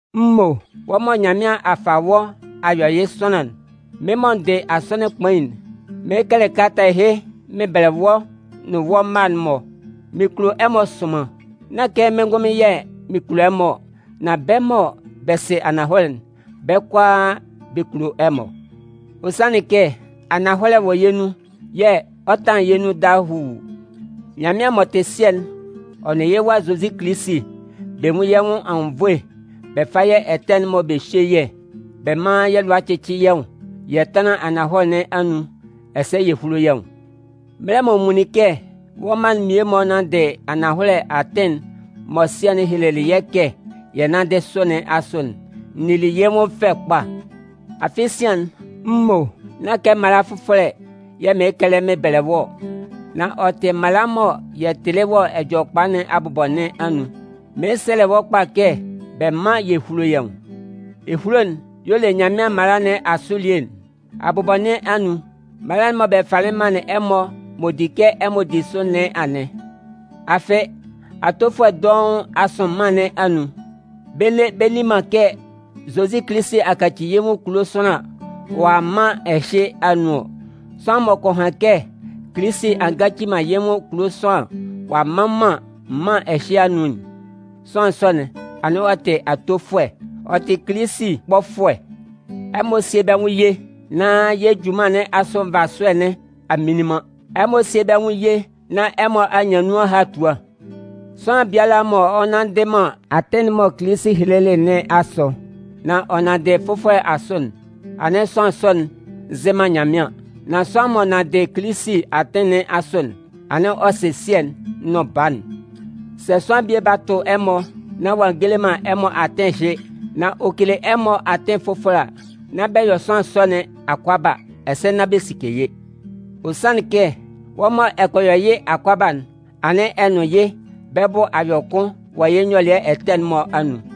M mo, Wɔ́ mɔ Nyanmɩan a fa wɔ́ a yɔ yɩ́ sʋanlan'n, mɩ́n mɔ n dɩ Asɔnɩn Kpain'n, mɩɩn kɛlɛ kalata ɛhɩ mɩn bɛlɛ wɔ́ nʋn wɔ́ mma'n-mɔ. Mɩn kulo ɛmɔ sʋnman. Nán kɛ mɩ́n ngʋnmɩn yɛ̂ mɩn kulo ɛmɔ ɔ, nan bɛ́ mɔ bɛ sɩ ananhɔlɛ'n, bɛ́ kʋalaa, bɛ kulo ɛmɔ. Ɔ sanlɩn kɛ ananhɔlɛ wɔ yɛ́ nun yɛ̂ ɔ 'tanlan yɛ́ nun dahuu. Nyanmɩan m'ɔ tɩ Sɩɛ'n ɔ nʋn yɩ́ Wa Zozi Kilisi, bɛ nwún yɛ́ nwʋn anwunnvoe bɛ fá yɛ́ ɛtɛ'n-mɔ bɛ hyé yɛ́, bɛ mán yɛ́ lʋa cɩ́cɩ yɛ́ nwʋn yɛ tánlan ananhɔlɛ nɩn anun, ɛsɛ yɛ húlo yɛ́ nwʋn. Mɛlɛ mɔ n nwunlin kɛ wɔ́ mma'n mmie-mɔ nanndɩ ananhɔlɛ atɩn'n mɔ Sɩɛ'n helelɩ yɛ́ kɛ yɛ nánndɩ sʋ nɩn asʋ'n, n nili yɩ́ nwʋn fɛ kpa. Afɩ sian'n, m mo, nán kɛ mala fʋfɔlɛ yɛ̂ mɩɩn kɛlɛ mɩn bɛlɛ wɔ́ ɔ, nan ɔ tɩ mala mɔ yɛ tɩlɩ wɔ Ɛjɔlɛkpa nɩn abʋbɔ nɩn anun. Mɩɩn sɛlɛ wɔ́ kpa kɛ bɛ mán yɛ húlo yɛ́ nwʋn. Ehulo'n y'ɔ le Nyanmɩan mala nɩn asʋ elie'n. Abʋbɔ nɩn anun, mala'n mɔ bɛ falɩ manlɩn ɛmɔ m'ɔ di kɛ ɛmɔ di sʋ nɩn anɩn. Afɩ, atofʋɛ dɔʋn a sʋn mân nɩn anun. Bɛ nne bɛ nni man kɛ Zozi Kilisi a kaci yɩ́ nwʋn kulo sʋanlan ɔ'a a mân ɛhɩ anun ɔ. Sʋanlan m'ɔ kɔ han kɛ Kilisi a ngaci man yɩ́ nwʋn kulo sʋanlan ɔ'a mma man mân ɛhɩ anun'n, sʋanlan sɔ'n, anɩn ɔ tɩ atofʋɛ, ɔ tɩ Kilisi kpɔfʋɛ. Ɛmɔ síe bɛ́ nwʋn ye nán yɛ́ junman nɩn asʋ nvasʋɛ nɩn a mminlin man. Ɛmɔ síe bɛ́ nwʋn ye nán ɛmɔ a nyan nun ahatua. Sʋanlan biala mɔ ɔ nnanndɩ man atɩn'n mɔ Kilisi helelɩ nɩn asʋ nan ɔ nanndɩ fʋfɔlɛ asʋ'n, anɩn sʋanlan sɔ'n nzɩ man Nyanmɩan. Nan sʋanlan m'ɔ nanndɩ Kilisi atɩn nɩn asʋ'n, anɩn ɔ sɩ Sɩɛ'n nʋn Baa'n. Sɛ sʋanlan bie ba tʋ ɛmɔ nán ɔ'a ngele man ɛmɔ atɩn ɛhɩ, nan ɔ kele ɛmɔ atɩn fʋfɔlɛ a, nán bɛ yɔ sʋanlan sɔ nɩn akʋaba ɛsɛ nán bɛ sike yɩ́. Ɔ sanlɩn kɛ, wɔ́ mɔ ɛ kɔ yɔ yɩ́ akʋaba'n, anɩn ɛ nʋn yɩ́ bɛ́ bʋ a yɔ kʋn wɔ yɩ́ nyɔlɩɛ ɛtɛ'n-mɔ anun.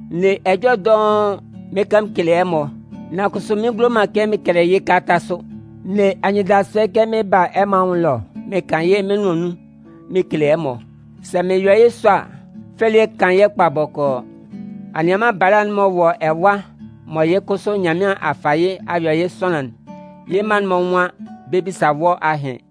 N ne ɛjɔlɛ dɔʋn mɩn kan mɩn kele ɛmɔ, nan kʋsʋ mɩn ngulo man kɛ mɩn kɛlɛ yɩ́ kalata sʋ. N ne anyɩndasʋɛ kɛ mɩn 'ba a ɛmɔ anwʋn ɛlɔ mɩn kan yɩ́ mɩ́n nʋan nun mɩn kele ɛmɔ. Sɛ mɩn yɔ yɩ́ sɔ a, fɛ elie 'kan yɛ́ kpa bɔkɔɔ. Anianman bala'n m'ɔ wɔ ɛwa mɔ yɩ́ kʋsʋ Nyanmɩan a fa yɩ́ a yɔ yɩ́ sʋanlan'n, yɩ́ mma'n-mɔ nwan bɛ 'bisa wɔ́ ahɩn.